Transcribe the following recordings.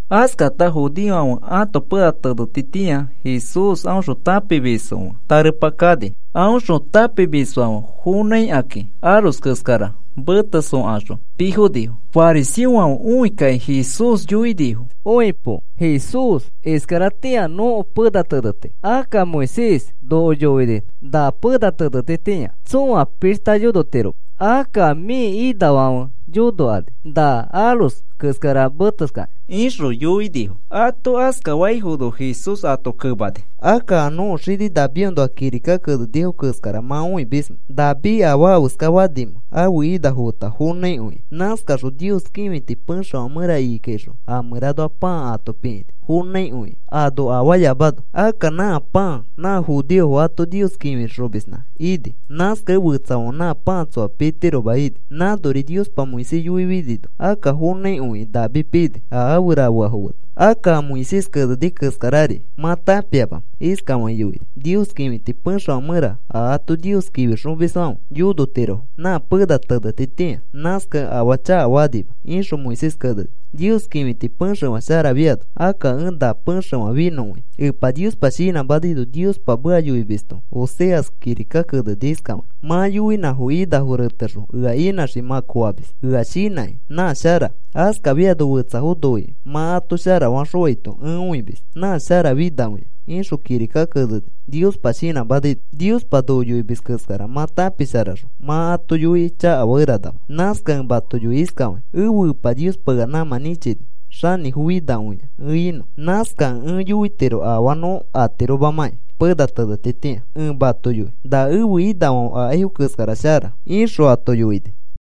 Askata judeofãfe ãto pena tenetitĩa Jesús aõxõ tãpimisfo fe tarepa kani. Aõxõ tãpimisfãfe fonãikakĩ aros keskara meteskaxõ pii fonifo. Fariseofãfe õikakĩ Jesús yoinifo: “Õipo, Jesús. Iskaratĩa nõko pena teneti. Akka Moisés noko yoini na pena tenetitĩa tsõa pishta yonotiroma. Akka mĩ inafãfe yonokani na aros keskara meteskakĩ,” ixõ yoinifo. Ato askafaifono Jesús ato kemani: “Akka, ¿a nõko xini Davidõnoa kirika kenenifo keskara mã õimismẽ David afaa afeska fanimẽ ãfe inafo feta fonãikõikĩ? Nãskaxõ Nios kĩfiti pexefã mẽra ikikaixõ a mẽranoa pãa ato pikĩni fonãikõikĩ ano afaayamano. Akka nã pãa nã judeofo ato Nios kĩfixomisfonã ini. Nãskakẽ fetsafãfe nã pãa tsõa pitiroma ini. Nãnori Niospa Moisés yoifinino akka fonãikõikĩ David pini a afe rafeafo feta. Akka, ¿a Moisés keneni keskarari mã tãpiamamẽ? Iskafakĩ yoini: ‘Nios kĩfiti pexefã mẽra a ato Nios kĩfixomisfãfe yonotirofo nã pena tenetitĩa. Nãskakẽ afaa chakafakanima,’ ixõ Moisés keneni. Nios kĩfiti pexefã sharafiano akka ẽ na pexefã finõkõia. Epa Niospa shinãmanaino Niospa meka yoimisto Oseas kirika keneni iskafakĩ: ‘Mã yoinãfo inafo retexõ ea inãxikĩ, mã koofamis ea shinãkĩ nã shara. Askafiano fetsafo noikĩ, mã ato sharafaxõaito ẽ õimis nã sharafinakõia,’ ixõ kirika keneni Niospa shinãmanaino. Niospa noko yoimis keskara mã tãpisharaxõ, mã ato yoikĩ chakafakeranama. Nãskakẽ ẽ mato yoi iskafakĩ, ẽfe Epa Niospa ea nãmã nĩchini xanĩfofinakõi ẽ inõ. Nãskakẽ ẽ yoitiro afaa nõ atiromakĩ pena tenetitĩa. Ẽ mato yoi na ẽfe inafãfe akaifo keskara shara,” ixõ ato yoini.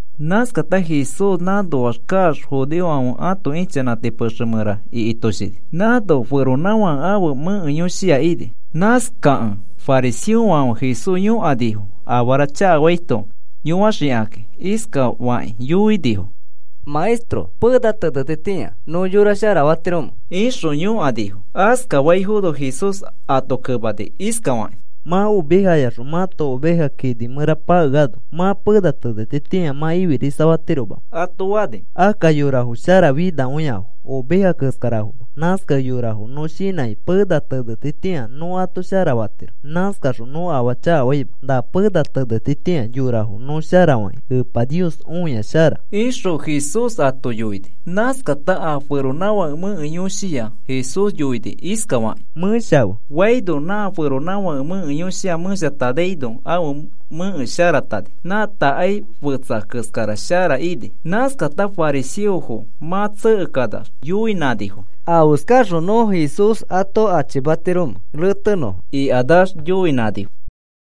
Nãskata Jesús nãnoax kaax judeofãfe ãto ichanãti pexe mẽra ikitoshini. Nãno feronãfake ãfe mẽke yõshia ini. Nãskakẽ fariseofãfe Jesús yõkanifo afara chakafaito yõaxikakĩ. Iskafakĩ yõkanifo: “Maestro, pena tenetitĩa, ¿nõ yora sharafatiromẽ?” ixõ yõkanifo. Askafaifono Jesús ato kemani iskafakĩ: “Mã ovejayaxõ mãto oveja kini mẽra pakeano, ¿mã pena tenetitĩa mã ifirisafatiromamẽ?” ato fani. “Akka yorafo sharafinakõiafo, oveja keskarafoma. Nãskakẽ yorafo nõ shinãkĩ pena tenetitĩa nõ ato sharafatiro. Nãskaxõ nõ afaa chakafaima. Na pena tenetitĩa yorafo nõ sharafakĩ Epa Niospa õia shara,” ixõ Jesús ato yoini. Nãskata a feronãfake mẽke yõshiya Jesús yoini iskafakĩ: “Mẽshafe,” faino, nã feronãfake mẽke yõshiya mẽshatanaino ãfe mẽke sharatani. Nã takai fetsa keskara shara ini. Nãskata fariseofo mã tsekekanax yoinãnifo: “¿Afeskaxõ nõ Jesús ato achimatiromẽ retenõfo?” ikanax yoinãnifo.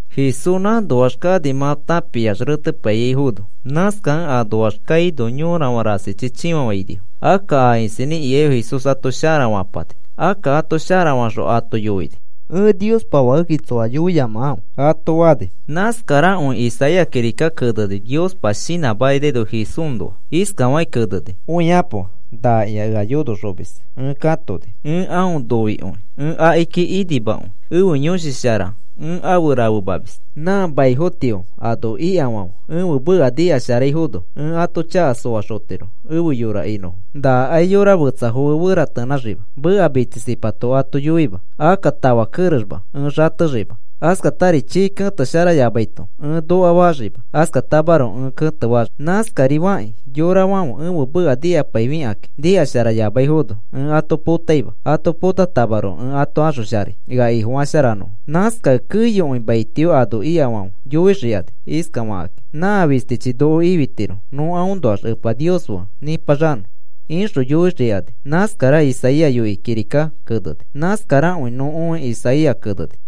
Jesús nãnoax kani mã tãpiax retepaiyaifono. Nãskakẽ anoax kaino yorafã rasichi chĩfafainifo. Akka a isinĩ ikaifo Jesús ato sharafapani. Akka ato sharafaxõ ato yoini: “Ẽ Niospa Fakekĩ tsoa yoiyamakãfe,” ato fani. Nãskarakõi Isaías kirika keneni Niospa shinãmanaino Jesúsnoa. Iskafakĩ keneni: Õikapo. Nakĩa ea yonoxomis ẽ katoni. Ẽ aõ noikõi. Ẽ akiki inimakõi. Ẽfe Yõshi Shara ẽ afe rafemamis. Nã maifotio ano ikafãfe ãfe meka nikasharaifono ẽ ãto chaka soaxotiro efe yora inõfo. Nakai yora fetsafo fe feratenãxima. Meka mitsisipato ato yoima. Akka tafa kerexma ẽ xatexima. Askatari chii ketesharayamaito ẽ nokafaxima. Askatamaroko ẽ ketefaxii. Nãskarifakĩ yorafãfe ẽfe meka nikapaifikakĩ nikasharayamaifono ẽ ato potaima. Ato potatamaroko ẽ ato axosharai ea Ifo sharafanõfo. Nãskakẽ keyokõi maitio ano ikafãfe yoixikani iskafakakĩ: “Nã fistichi noko ifitiro nõ aõnoax Epa Nios fe nĩpaxanõ,” ixõ yoixikani. Nãskara Isaías yoikĩ kirikaki keneni. Nãskarakõi nõ õi Isaías keneni.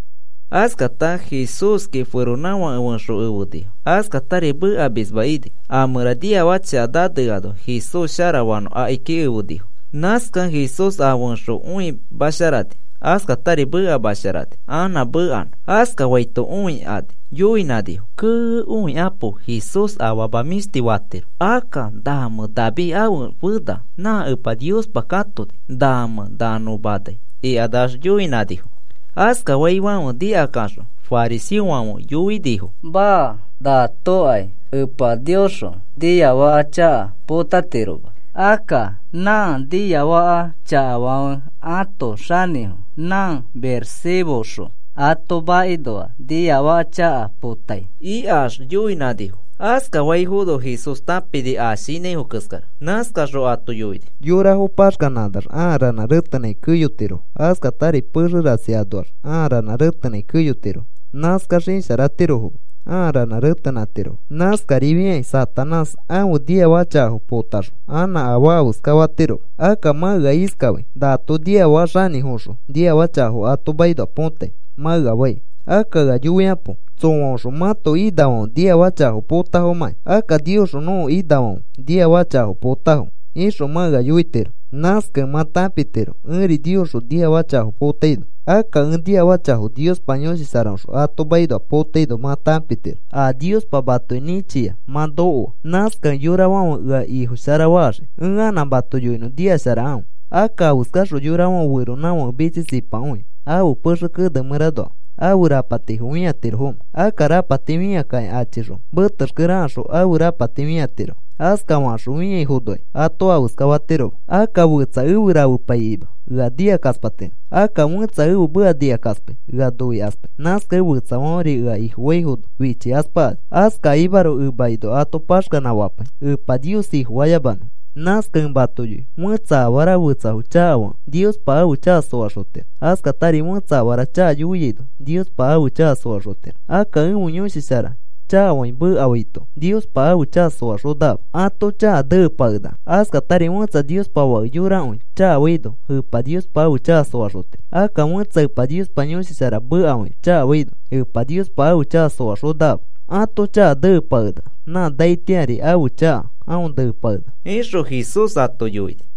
Askata Jesúski feronãfake fẽxo efenifo. Askatari mekamisma ini. A mẽra niafaka chaka naneano Jesús sharafanõ akiki efenifo. Nãskakẽ Jesús a fẽxo õimasharani, askatari mekamasharani anã mekanõ. Askafaito õikani yoinãnifo: “¡Kee! Õikapo. Jesús afama mĩshti shara fatiro. Akka, ¿namẽ David ãfe fena nã Epa Niospa katoni, nãmẽ na nõ manai?” ikax yoinãnifo. Askafaifãfe nikakaxõ fariseofãfe yoinifo: “Maa. Natokai Epa Niosxõ niafaka chaka potatiroma. Akka nã niafaka chakafãfe ãto xanĩfo nã Beelzebúxõ ato makinoa niafaka chaka potai,” ikax yoinãnifo. Askafaifono Jesús tãpini a shinãifo keskara. Nãskaxõ ato yoini: “Yorafo paxkanãkanax ãa ranã retenãi keyotirofo. Askatari pexe rasi anoax ãa ranã retenãi keyotirofo. Nãskax isharatirofoma ãa ranã retenãtirofo. Nãskarifiakĩ Satanás ãfe niafaka chakafo potaxõ anã afaa afeska fatiroma. Akka mã ea iskafai: ‘Nato niafaka xanĩfoõxõ niafaka chakafo ato makinoa potai,’ mã ea fai. Akka ea yoikapo, ¿tsõaõxõ mãto inafãfe niafaka chakafo potafomakĩ? Akka, ‘Niosxõ nõko inafãfe niafaka chakafo potafo,’ ixõ mã ea yoitiro. Nãskakẽ mã tãpitiro ẽri Niosxõ niafaka chakafo potaino. Akka ẽ niafaka chakafo Niospa Yõshi Sharaõxõ ato makinoa potaino mã tãpitiro a Niospa matoki nĩchiai mã nokoano. Nãskakẽ yorafãfe ea Ifo sharafaxii. “Ẽ anã mato yoinõ, nikasharakãfe. Akka, ¿afeskaxõ yorafãfe feronãfake mitsisipakõi ãfe pexe kene mẽranoa ãfe rapatifo fĩatirofomẽ? Akka rapati fĩakakĩ achixõ metexkere akaxõ ãfe rapati fĩatirofo. Askafakaxõ fĩaifonokai ato afeska fatiroma. “Akka fetsa efe rafepaikima ea nikakaspatiro. Akka fẽtsa ẽfe meka nikakaspai ea noikaspai. Nãskakẽ fetsafãferi ea Ifofaifono fichikaspakani. Askakimaroko emakinoa ato paxkanãfapai Epa Nios Ifofayamanõfo. “Nãskakẽ ẽ mato yoi. Fẽtsa afara fetsafo chakafakẽ Niospa ãfe chaka soaxotiro. Askatari fẽtsa afara chaka yoiaino Niospa ãfe chaka soaxotiro. Akka ẽfe Yõshi Shara chakafakĩ mekafaito, Niospa ãfe chaka soaxonakama. Ãto chaka neepakenaka. Askatari fẽtsa Niospa Fake yorakõi chakafaino Epa Niospa ãfe chaka soaxotiro. Akka fẽtsa Epa Niospa Yõshi Shara mekafakĩ chakafaino, Epa Niospa ãfe chaka soaxonakama. Ãto chaka neepakenaka. Nã naitĩari ãfe chaka aõ neepakenaka,” ixõ Jesús ato yoini.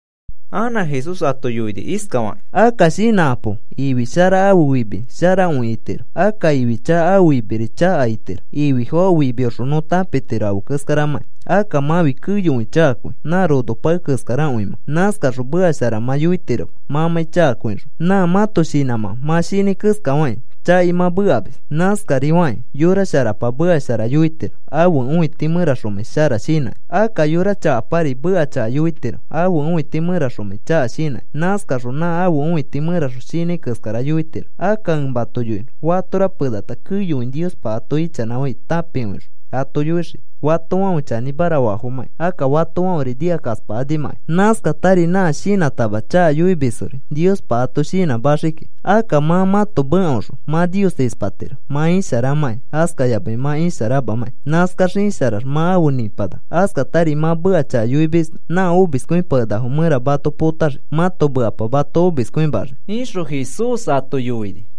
Anã Jesús ato yoini iskafakĩ: “Akka shinãkapo. Ifi shara ãfe fimi sharakõi itiro. Akka ifi chaka ãfe fimiri chaka itiro. Ififo ãfe fimioxõ nõ tãpitiro afe keskaramãkĩ. Akka mãfi keyokõi chakakõi, nã rono pae keskarakõi mã. Nãskaxõ meka shara mã yoitiroma mãmãi chakakõixõ. Nã mãto shinãmã mã shinãi keskafakĩ chakai mã mekamis. Nãskarifakĩ yora sharapa meka shara yoitiro, ãfe õiti mẽraxomãi shara shinãkĩ. Akka yora chakapari meka chaka yoitiro, ãfe õiti mẽraxomãi chaka shinãkĩ. Nãskaxõ nã ãfe õiti mẽraxõ shinãi keskara yoitiro. Akka ẽ mato yoinõ. Fatora penata keyokõi Niospa ato ichanãfai tãpikõixõ ato yoixiki fatofãfe chanĩmara faafomãkĩ, akka fatofãferi nikakaspakanimakĩ. Nãskatari nã shinãtama chaka yoimisfori Niospa ato shinãmaxii kiki. Akka mã mãto mekaoxõ mã Nios ispatiro mã isharamãkĩ, askayamai mã isharamamãkĩ. Nãskax isharax mã afe nipanaka. Askatari mã meka chaka yoimisno nã omiskõipakenakafo mẽra mato potaxii. Mãto mekapa mato omiskõimaxii,” ixõ Jesús ato yoini.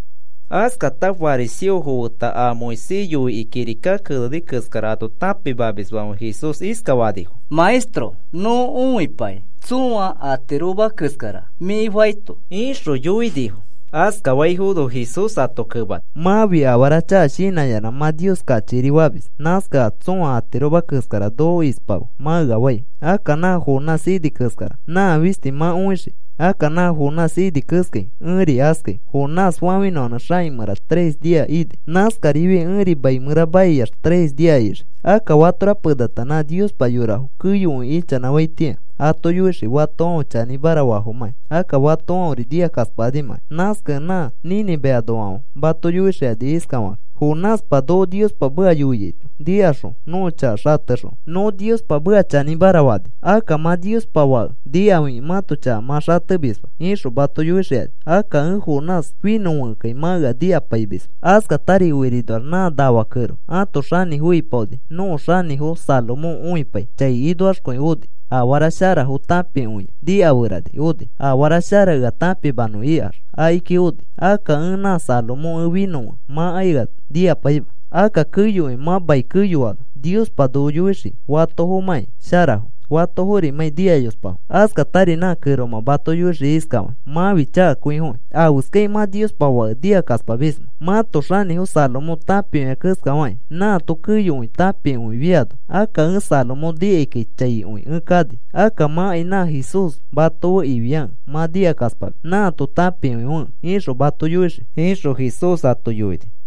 Askata fariseofo feta a Moisés yoikĩ kirika keneni keskara ato tãpimamisfãfe Jesús iskafanifo: “Maestro, nõ õipai tsõa atiroma keskara mĩ faito,” ixõ yoinifo. Askafaifono Jesús ato kemani: “Mãfi afara chaka shinãyanã mã Nios kachikiri famis. Nãskakẽ, ‘A tsõa atiroma keskara noko ispafe,’ mã ea fai. Akka nã Jonás ini keskara nã fisti mã õixii. Akka nã Jonás ini keskai ẽri askai. Jonás fafĩnõa xaki mẽra tres nia ini. Nãskarifiai ẽri mai mẽra maiax tres nia ixii. Akka fatora penata nã Niospa yorafo keyokõi ichanãfaitĩa ato yoixii fatofãfe chanĩmara faafomakĩ, akka fatofãferi nikakaspakanimãkai. Nãskakẽ nã Nínive anoafãfe mato yoixikani iskafakakĩ: ‘Jonáspa noko Niospa meka yoiaito nikaxõ nõko chaka xatexõ nõ Niospa meka chanĩmara fani. Akka mã Niospa Fake nikafikĩ mãto chaka mã xatemisma,’ ixõ mato yoixikani. Akka ẽ Jonás finõfekẽkai mã ea nikapaimisma. Askatari okirinoax nã nafa kẽro ãto xanĩfo ipaoni nõko xanĩfo Salomón õipai chai inoaxkõi oni. Afara sharafo tãpikõia nikaferani oni. ‘Afara shara ea tãpimanõ,’ ikax akiki oni. Akka ẽ nã Salomón ẽ finõfekẽ, mãkai ea nikapaima. Akka keyokõi mã mai keyoano Niospa noko yoixii fatofomãkĩ sharafo fatoforimãkĩ nikayospafo. Askatari nã kẽromã mato yoixii iskafakĩ: ‘Mãfi chakakõifokĩ. ¿Afeskakĩ mã Niospa Fake nikakaspamismẽ? Mãto xanĩfo Salomón tãpikõia keskafakĩ nãato keyokõi tãpikõifiano. Akka ẽ Salomón nikaikai chaikõi ẽ kani. Akka mãkai nã Jesús mato fe ifiakẽ mã nikakaspamis nãato tãpikõifekẽ,’ ixõ mato yoixii,” ixõ Jesús ato yoini.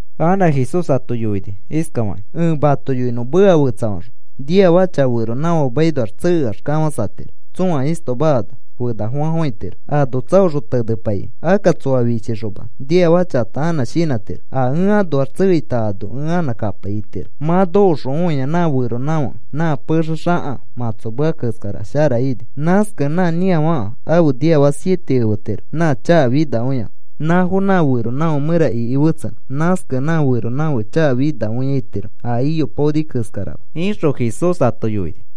Anã Jesús ato yoini iskafakĩ: “Ẽ mato yoinõ meka fetsafaxõ. Niafaka chaka feronãfake makinoax tsekeax kafãsatiro tsõa istoma ano fenafofãfofãitiro ano tsaoxõ tenepaikĩ. Akka tsoa fichixoma niafaka chakata anã shinãtiro: ‘A ẽ anoax tsekeita ano ẽ anã kapai,’ itiro. Mã nokoxõ õia nã feronãfake nã pexe xaka mãtsomea keskara shara ini. Nãskakẽ nã nĩafaka afe niafaka siete efetiro nã chaka finakõiafo, nãfo nã feronãfake mẽra iki fetsenõ. Nãskakẽ nã feronãfake chaka finakõi itiro a iypaoni keskarama,” ixõ Jesús ato yoini.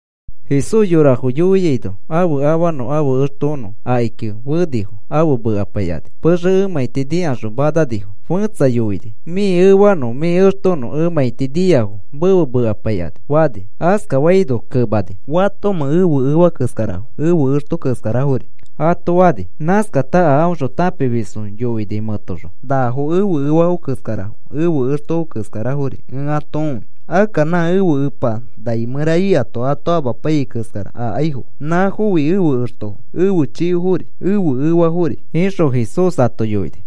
Jesús yorafo yoiaino ãfe afanõ ãfe extonõ akiki fenifo afe mekapaikani, pexe emãiti nikaxõ mananifo. Fẽtsa yoini: “Mĩ efanõ mĩ extonõ emãiti niafo mefe mekapaikani,” fani. Askafaino kemakĩ: “¿Fatomẽ ẽfe efa keskarafo ẽfe exto keskarafori?” ato fani. Nãskata a aõxõ tãpimisfo yoini mẽtoxõ: “Nafo ẽfe efafo keskarafo, ẽfe exto keskarafori ẽ ato õi. Akka nã ẽfe Epa nai mẽra ikato ato amapaiyai keskara akaifo nãfofi ẽfe extofo ẽfe chikofori ẽfe efafori,” ixõ Jesús ato yoini.